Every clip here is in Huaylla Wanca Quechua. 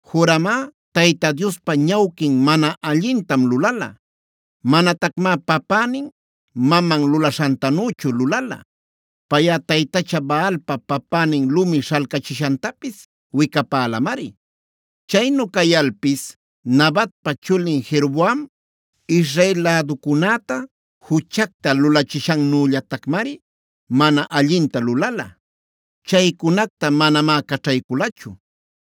Joramꞌa Tayta Diospa ñawquin mana allintam lulala. Manatacmá papänin-maman lulaśhantanüchu lulala. Payꞌa taytacha Baalpa papänin lumi śhalcachishantapis wicapälamari. Chaynu cayalpis Nabatpa chulin Jeroboam Israel läducunäta juchacta lulachishannüllatacmari mana allinta lulala. Chaycunacta manamá caćhayculachu.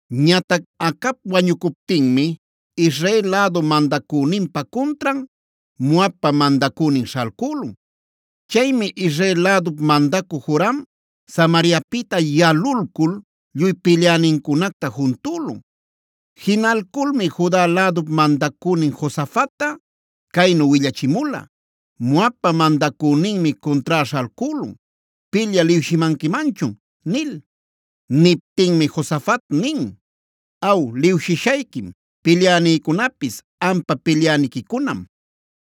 Ñatac Acab wañucuptinmi Israel lädu mandacüninpa cuntran, Moabpa mandacünin śhalcülun. Chaymi Israel lädup mandacü Joram Samariapïta yalulcul lluy pilyänincunacta juntülun. Jinalculmi Juda lädup mandacünin Josafatta caynu willachimula: “Moabpa mandacüninmi cuntrá śhalcülun. ¿Pilyä liwshimanquimanchun?” nil. Niptinmi Josafat nin: “Aw, liwshishayquim, pilyänïcunapis ampa pilyäniquicunam,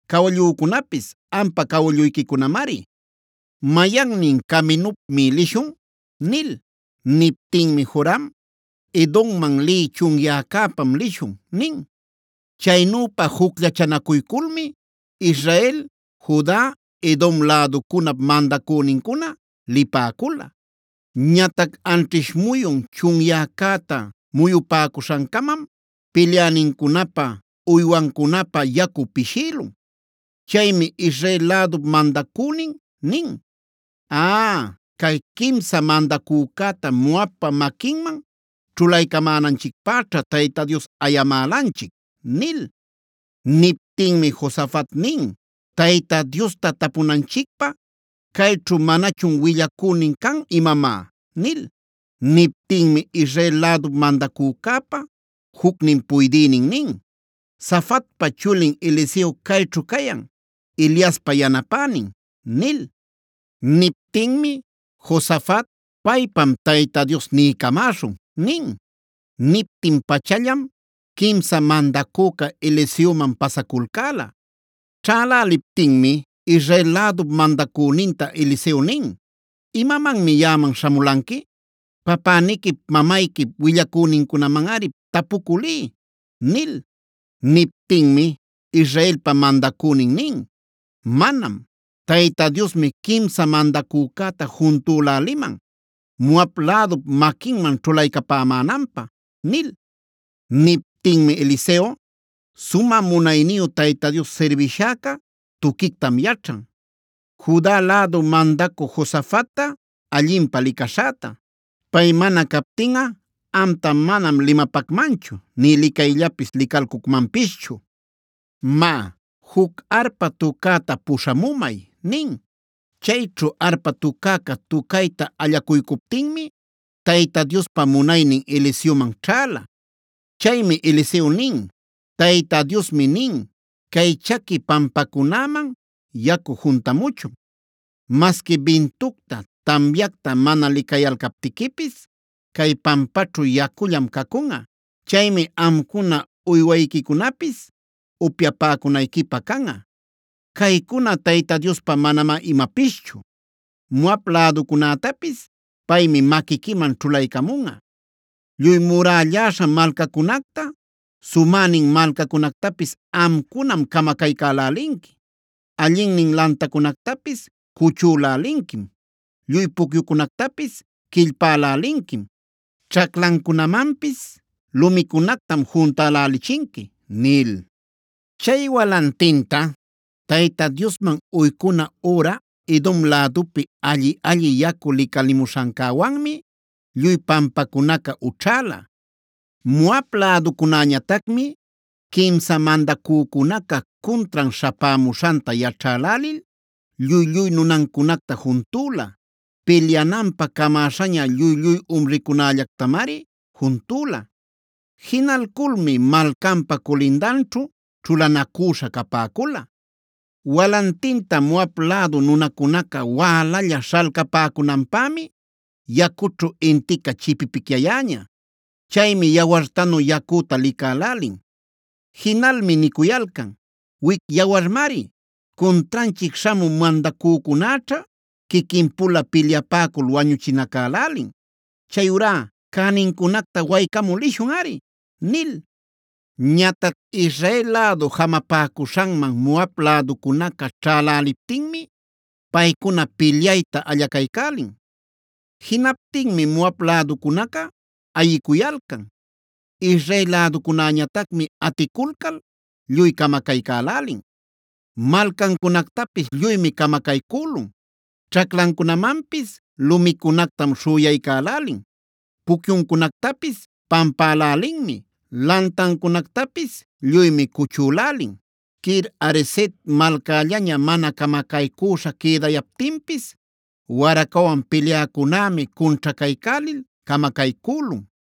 cawallücunapis ampa cawalluyquicunamari. ¿Mayannin caminupmi lishun?” nil. Niptinmi Joram: “Edomman lï chunyäcäpam lishun” nin. Chaynüpa jucllachanacuyculmi Israel, Juda, Edom läducunap mandacünincuna lipäcula. Ñatac anćhish muyun chunyäcäta muyupäcuśhancamam pilyänincunapä, uywancunapä yacu pishïlun. Chaymi Israel lädup mandacünin nin: “¡Aaa, cay quimsan mandacücäta Moabpa maquinman ćhulaycamänanchicpäćha Tayta Dios ayamälanchic!” nil. Niptinmi Josafat nin: “Tayta Diosta tapunanchicpä, ¿cayćhu manachun willacünin can imamá?” nil. Niptinmi Israel lädup mandacücäpa jucnin puydïnin nin: “Safatpa chulin Eliseo cayćhu cayan, Eliaspa yanapänin” nil. Niptinmi Josafat: “Paypam Tayta Dios niycamäśhun” nin. Niptin-pachallam quimsan mandacüca Eliseoman pasaculcäla. Ćhäläliptinmi Israel lädup mandacüninta Eliseo nin: “¿Imamanmi yaꞌaman śhamulanqui? Papäniquip mamayquip willacünincunamanꞌari tapucü liy” nil. Niptinmi Israelpa mandacünin nin: “Manam. Tayta Diosmi quimsa mandacücäta juntüläliman Moab lädup maquinman ćhulaycapämänanpä” nil. Niptinmi Eliseo: “Sumä munayniyu Tayta Dios sirbishäca tuquictam yaćhan, Juda lädu mandacü Josafatta allinpä licaśhäta. Pay mana captinꞌa amta manam limapacmanchu nï licayllapis licalcucmanpischu. Má, juc arpa tucäta puśhamumay” nin. Chayćhu arpa tucäca tucayta allacuycuptinmi Tayta Diospa munaynin Eliseoman ćhäla. Chaymi Eliseo nin: “Tayta Diosmi nin: Cay chaqui pampacunäman yacu juntamuchun. Masqui bintucta, tamyacta mana licayalcaptiquipis cay pampaćhu yacullam cacunꞌa. Chaymi amcuna, uywayquicunapis upyapäcunayquipä canꞌa. Caycuna Tayta Diospa manamá imapischu. Moab läducunätapis paymi maquiquiman ćhulaycamunꞌa. Lluy murälläśha malcacunacta, sumänin malcacunactapis amcunam camacaycälälinqui, allinnin lantacunactapis cuchülälinquim, lluy pucyucunactapis quillpälälinquim, ćhaclancunamanpis lumicunactam juntälächinqui” nil. Chay walantinta Tayta Diosman uycuna üra Edom lädupi alli-alli yacu licalimuśhancäwanmi lluy pampacunaca ućhäla. Moab läducunäñatacmi quimsa mandacücunaca cuntran śhapämuśhanta yaćhälälil lluy-lluy nunancunacta juntüla. Pilyananpä camäśhaña lluy-lluy umricunällactamari juntüla. Jinalculmi malcanpa culindanćhu ćhulanacüśha capäcula. Walantinta Moab lädu nunacunaca wälalla śhalcapäcunanpämi yacućhu intica chipipicyayäña. Chaymi yawartanu yacüta licälälin. Jinalmi nicuyalcan: “¡Wic yawarmari! Cuntranchic śhamü mandacücunäćha quiquinpula pilyapäcul wañuchinacalälin. Chayurá, cänincunacta waycamü lishunꞌari” nil. Ñatac Israel lädu jamapäcuśhanman Moab läducunaca ćhaläliptinmi paycuna pilyayta allacaycälin. Jinaptinmi Moab läducunaca ayicuyalcan. Israel läducunäñatacmi aticulcal lluy camacaycälälin. Malcancunactapis lluymi camacaycülun, ćhaclancunamanpis lumicunactam śhüyaycälälin, pucyuncunactapis pampälälinmi, lantancunactapis lluymi cuchülälin. Kir-hareset malcallaña mana camacaycüśha quïdayaptinpis waracawan pilyäcunämi cunćhacaycälil camacaycülun.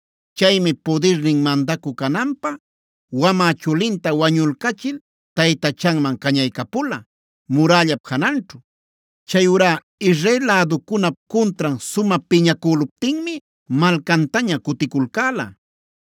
Chaymi pudirnin mandacü cananpä wamä chulinta wañulcachil taytachanman cañaycapula, murällap jananćhu. Chayurá Israel läducunap cuntran sumä piñacüluptinmi malcantaña cuticulcäla.